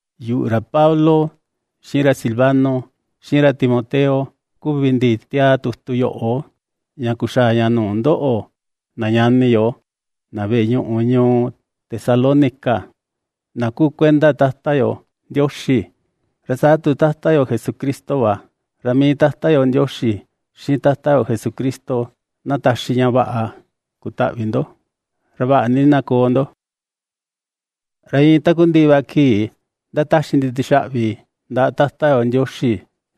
Yuꞌu, ra Pablo, xiꞌin ra Silvano, xiꞌin ra Timoteo kuvi ndi ^tiaa tutu yoꞌo, ña kuxaa ña nuu ndoꞌo na ñani yo, na veꞌe ñuꞌu ñuu Tesalónica na kuu kuenda Tata yo Ndioxi, ra saa tu Tata yo Jesucristo va. Ra mii Tata yo Ndioxi, xiꞌin Tata yo Jesucristo na taxi ña vaꞌa kutaꞌvi ndo, ra vaꞌa ni na koo ndo. Ra iin takundiꞌi va kii ndataxi ndi tixaꞌvi ndaꞌa Tata yo Ndioxi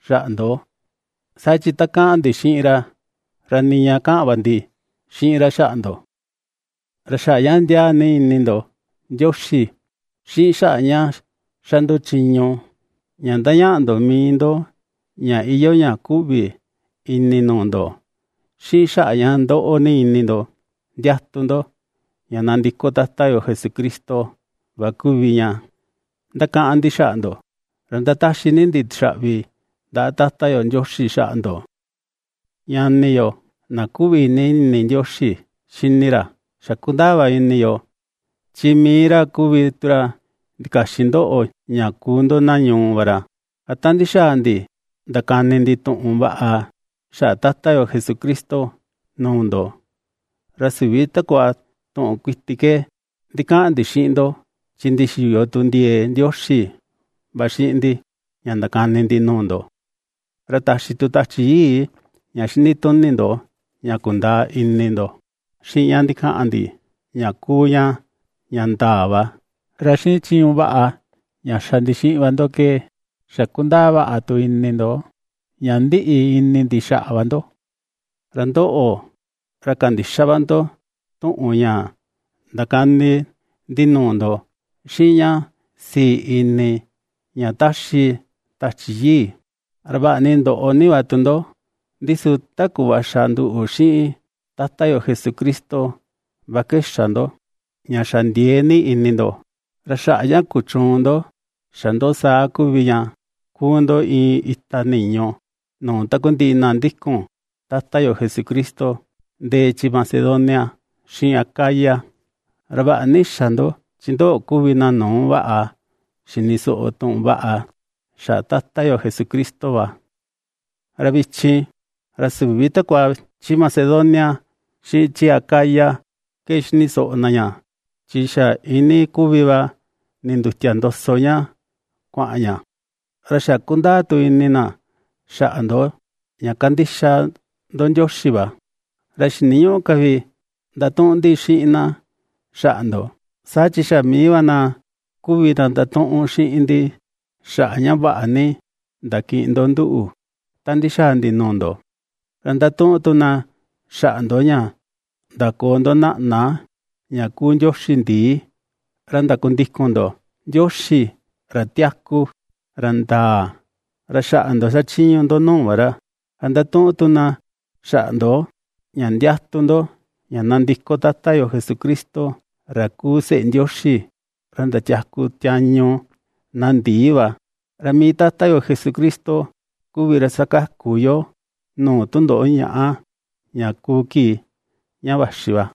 xaꞌa ndo, saa chi ta kaꞌan ndi xiꞌin ra, ra niña kaꞌan va ndi xiꞌin ra xaꞌa ndo. Ra xaꞌa ña ndiaa ni ini ndo Ndioxi, xiꞌin xaꞌa ña ^xa ndo chiñu ña ^ndañaꞌa ndo mii ndo ña iyoo ña kuꞌvi ini nuu ndo, xiꞌin xaꞌa ña ^ndoꞌo ni ini ndo ndiatu ndo, ña nandiko Tata yo Jesucristo va kuvi ña ndakaꞌan ndi xaꞌa ndo, ra ^ndataxi ni ndi tixaꞌvi ndaꞌa Tata yo Ndioxi xaꞌa ndo. Ñani yo, na ^kuꞌvi ni ini Ndioxi xini ra, xa kundaa va ini yo, chi mii ra kuvi tu ra ndikaxin ndoꞌo ña kuu ndo na ñuu va ra. Ra ta ndixaa ndi ndakani ndi tuꞌun vaꞌa xaꞌa Tata yo Jesucristo nuu ndo, ra süvi takua tuꞌun kuiti ke ndikaꞌan ndi xiꞌin ndo, chi ndixiyo tu ndiee Ndioxi va xiꞌin ndi ña ndakani ndi nuu ndo. Ra taxi tu Tachi Yii ña xinituni ndo ña kundaa ini ndo xiꞌin ña ndikaꞌan ndi ña kuu ña ña ndaa va. Ra xiꞌin chiñu vaꞌa ña xa ndi xiꞌin va ndo ke xa kundaa vaꞌa tu ini ndo ña ndiꞌi ini ndi xaꞌa va ndo. Ra ndoꞌo, ra kandixa va ndo tuꞌun ña ndakani ndi nuu ndo xiꞌin ña sii ini ña ^taxi Tachi Yii, ra vaꞌa ni ndoꞌo ni va tu ndo, ndi su ta kuꞌva xa nduꞌu xiꞌin Tata yo Jesucristo va ke xa ndo, ña xa ndiee ni ini ndo. Ra xaꞌa ña kuchuun ndo xa ndo saa kuvi ña, kuu ndo iin ita niñu nuu takundiꞌi na ndikun Tata yo Jesucristo ndee chi Macedonia xiꞌin Acaya. Ra vaꞌa ni xa ndo, chi ndoꞌo kuvi na nuu vaꞌa xini soꞌo tuꞌun vaꞌa xaꞌa Tata yo Jesucristo va, ra vichin, ra süvi takua chi Macedonia xiꞌin chi Acaya ke xini soꞌo na ña, chi xa iinii kuvi va nindutia ndoso ña kuaꞌan ña, ra xa kundaa tu ini na xaꞌa ndo ña kandixa ndo Ndioxi va, ra xiniñüꞌu ka vi ndatuꞌun ndi xiꞌin na xaꞌa ndo. Saa chi xa mii va na kuvi na ndatuꞌun xiꞌin ndi xaꞌa ña vaꞌa ni ndakiꞌin ndo nduꞌu ta ndixaa ndi nuu ndo, ra ^ndatuꞌun tu na xaꞌa ndo ña ndakoo ndo naꞌna ña kuu ndioxi ndii, ra ndakundikun ndo Ndioxi ra tiaku, ra ndaa, ra xaꞌa ndo xachiñu ndo nuu va ra. Ra ^ndatuꞌun tu na xaꞌa ndo, ña ndiatu ndo ña nandiko Tata yo Jesucristo, ra kuu seꞌe Ndioxi, ra ndatiaku tiañu na ndii va. Ra mii Tata yo Jesucristo kuvi ra ^sakaku yoo nuu tundoꞌo ñaꞌa, ña kuu kii ña vaxi va.